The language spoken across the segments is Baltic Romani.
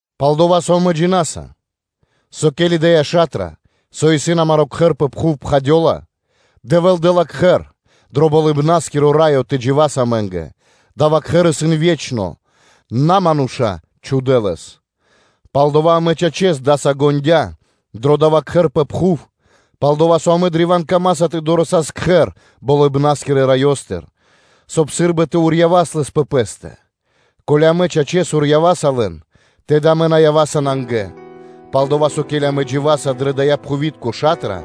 Пал-дова́ со амэ джина́са, со, ке́ли дая́ ша́тра – со исын амаро́ кхэр пэ пхув, пхадёла, то Дэвэ́л дэ́ла кхэр дро Болыбна́скиро Раё тэ джива́с амэ́нгэ, дава́ кхэр исын ве́чно, и на мануша́ чхудэ́ лэс. Палдава́ амэ, чачэс, пхарэ́с даса ґондя́ (уздыхинаса) дро дава́ Кхэр пэ пхув, пал-дова́ со амэ древа́н камаса тэ дорэсас (тэ долас) кхэр Болыбна́скирэ Раёстыр, соб (кай) сы́рбы тэ урьявас лэс пэ пэ́стэ; ко́ли амэ, чачэс, урьяваса лэн, тэды амэ на ява́са нангэ. Палдова́ со, ке́ли амэ дживаса дрэ дая́ пхувитко ша́тра,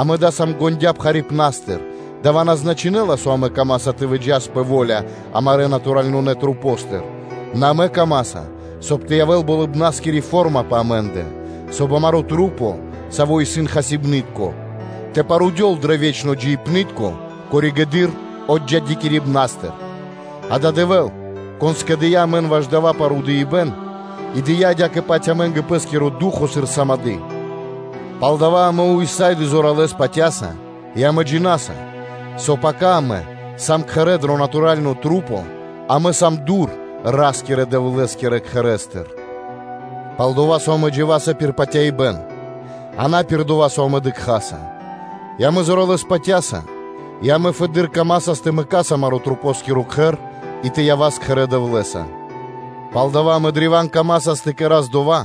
амэ даса ґондя́ (уздыхинаса) пхарипнастыр; дава́ на значынэ́ла, со амэ камаса тэ выджас пэ во́ля амарэ́ чачунэ́ масэ́ндыр, нэ амэ камаса, соб (кай) тэ явэ́л болыбна́скири фо́рма пэ амэ́ндэ, соб (кай) амарэ́ маса́, савэ́ исын хасибны́тка, тэ парудён дро ве́чно джиибны́тко пало́ (после) отджидякирибэн. Дава́ Дэвэ́л, Кон скэдыя́ амэн ваш дава́ парудыибэн и дыя́ адя́кэ-паць амэ́нгэ Пэ́скиро Ду́хо (Фа́но) сыр сымады́ (залого). Палдава́ амэ ўса́ды (сак) зоралэ́с патя́са и амэ джина́са, со пака амэ сам кхэрэ́ дрэ чачунэ́ маса́, амэ сам дур Ра́скирэ-Дэвлэ́скирэ Кхэрэ́стыр, пал-дова́ со амэ дживаса пир патяибэ́н, а на пир дова́, со амэ дыкхаса, и амэ зоралэ́с патя́са и амэ фэды́р камасас тэ мэкас амаро́ кхэр ваш маса́ и тэ явас кхэрэ́ Дэвлэ́са. Пал дава́ амэ древа́н камасас тэ кэра́с дова́,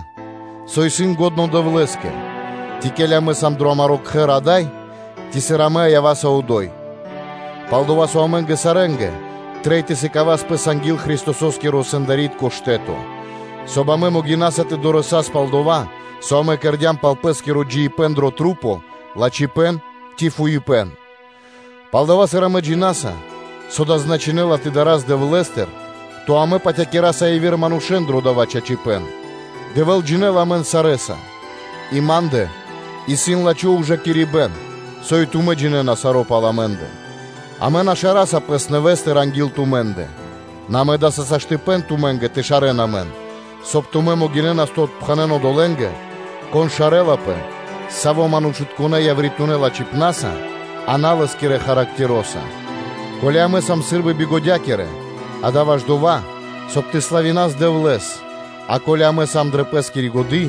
со исын лачхо́ Дэвлэ́скэ, ци, ке́ли амэ сам дро амаро́ кхэр ада́й, ци, сыр амэ ява́са одо́й. Пал-дова́ со амэ́нгэ сарэ́нгэ трэй тэ сыкавас пэс анги́л Христосо́скиро сэндари́тко штэ́то, соб (кай) амэ могинаса тэ дорэсас (тэ долас) пал дова́, со амэ кэрдя́м пал пэ́скиро джиибэ́н дрэ маса́: лачхипэ́н ци фуипэ́н. Палдава́, сыр амэ джина́са, со дава́ значынэ́ла тэ дарас Дэвлэ́стыр, то амэ патякира́са явирэ манушэ́н дро дава́ чачипэ́н; Дэвэ́л джинэ́ла амэн сарэ́са, и ма́ндэ исын лачхо́ ужакирибэ́н, со и тумэ́ джинэ́на саро́ пал амэ́ндэ. Амэ на шараса пэс нэвэ́стыр анги́л тумэ́ндэ, нэ амэ да́са саштыпэ́н (возможность) тумэ́нгэ тэ шарэ́н амэн, соб (кай) тумэ́ могинэ́нас тэ отпхэнэн одолэ́нгэ, кон шарэлапэ саво́ манушытконэ́ явритунэ́ лачхипна́са, а на лэ́скирэ характероса. Ко́ли амэ сам сы́рбы бигодякирэ, дава́ исын ваш дова́, соб (кай) тэ славинас Дэвлэ́с, а ко́ли амэ сам дрэ пэ́скири годы́,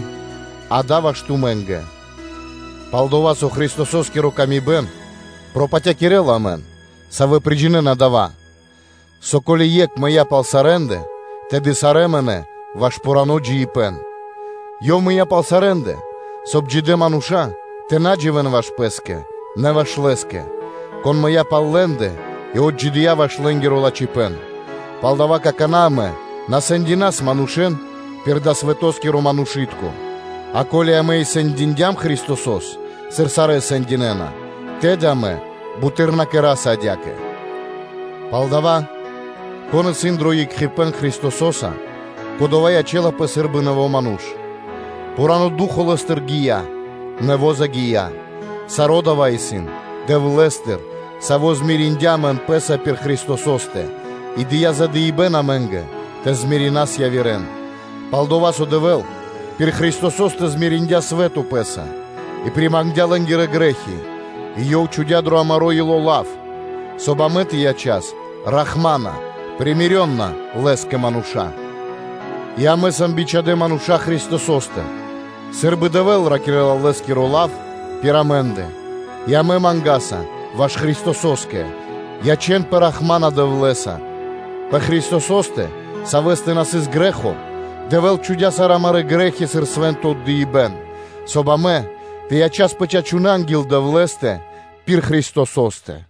дава́ исын ваш тумэ́нгэ. Пал-дова́ со Христососкири ла́ска пропатякирэла амэн, савэ́ приджинэна дава́, со; ко́ли Екх мыя́ пал сарэ́ндэ, тэды сарэ́ мынэ́ ваш пхурано́ джиибэ́н; Ёв мыя́ пал сарэ́ндэ, соб (кай) джидэ́ мануша́ тэ на дживэ́н ваш пэ́скэ, нэ ваш Лэ́скэ, Кон мыя́ пал лэ́ндэ и отджидыя́ ваш лэ́нгиро лачхипэ́н. Палдава́ какана́ амэ на сэндинас манушэ́н пир далэ́-свэтоскиро манушы́тко; а ко́ли амэ и сэндиндям Христосо́с, сыр сарэ́ сэндинэна, тэды амэ буты́р на кэра́са адя́кэ. Палдава́, кон исын дро екхипэ́н Христосо́са, кодова́ ячэ́лапэ сы́рбы нэво́ ману́ш: пхурано́ ду́хо (фа́но) лэ́стыр гия́, нэво́ загия́: саро́ дава́ исын Дэвлэ́стыр, Саво́ змириндя (кэрдя́ рахманонэ́нца) амэн Пэ́са пир Христосо́стэ и дыя́ задыибэн амэ́нгэ тэ примиринас явирэ́н: пал-дова́ со Дэвэ́л пир Христосо́стэ примириндя свэ́то Пэ́са и примангдя лэ́нгирэ грэ́хи, и Ёв чхудя́ дро амаро́ ило́ лав, соб (кай) амэ тэ ячас Лэ́скэ рахманонэ манушэ́нца. И амэ сам бичхадэ́ мануша́ Христосостыр сы́рбы Дэвэ́л ракирэ́ла Лэ́скиро лав пир амэ́ндэ, и амэ мангаса ваш Христосо́стэ: ячэ́нпэ рахмана (явэ́н кхэтанэ́) Дэвлэ́са. Пэ Христосо́стэ, Савэ́стэ на сыс грэ́хо, Дэвэ́л чхудя́ сарэ́ амарэ́ грэ́хи сыр свэ́нто отдыибэ́н, соб (кай) амэ тэ ячаспэ чачунэнца анги́л Дэвлэ́стэ пир Христосо́стэ.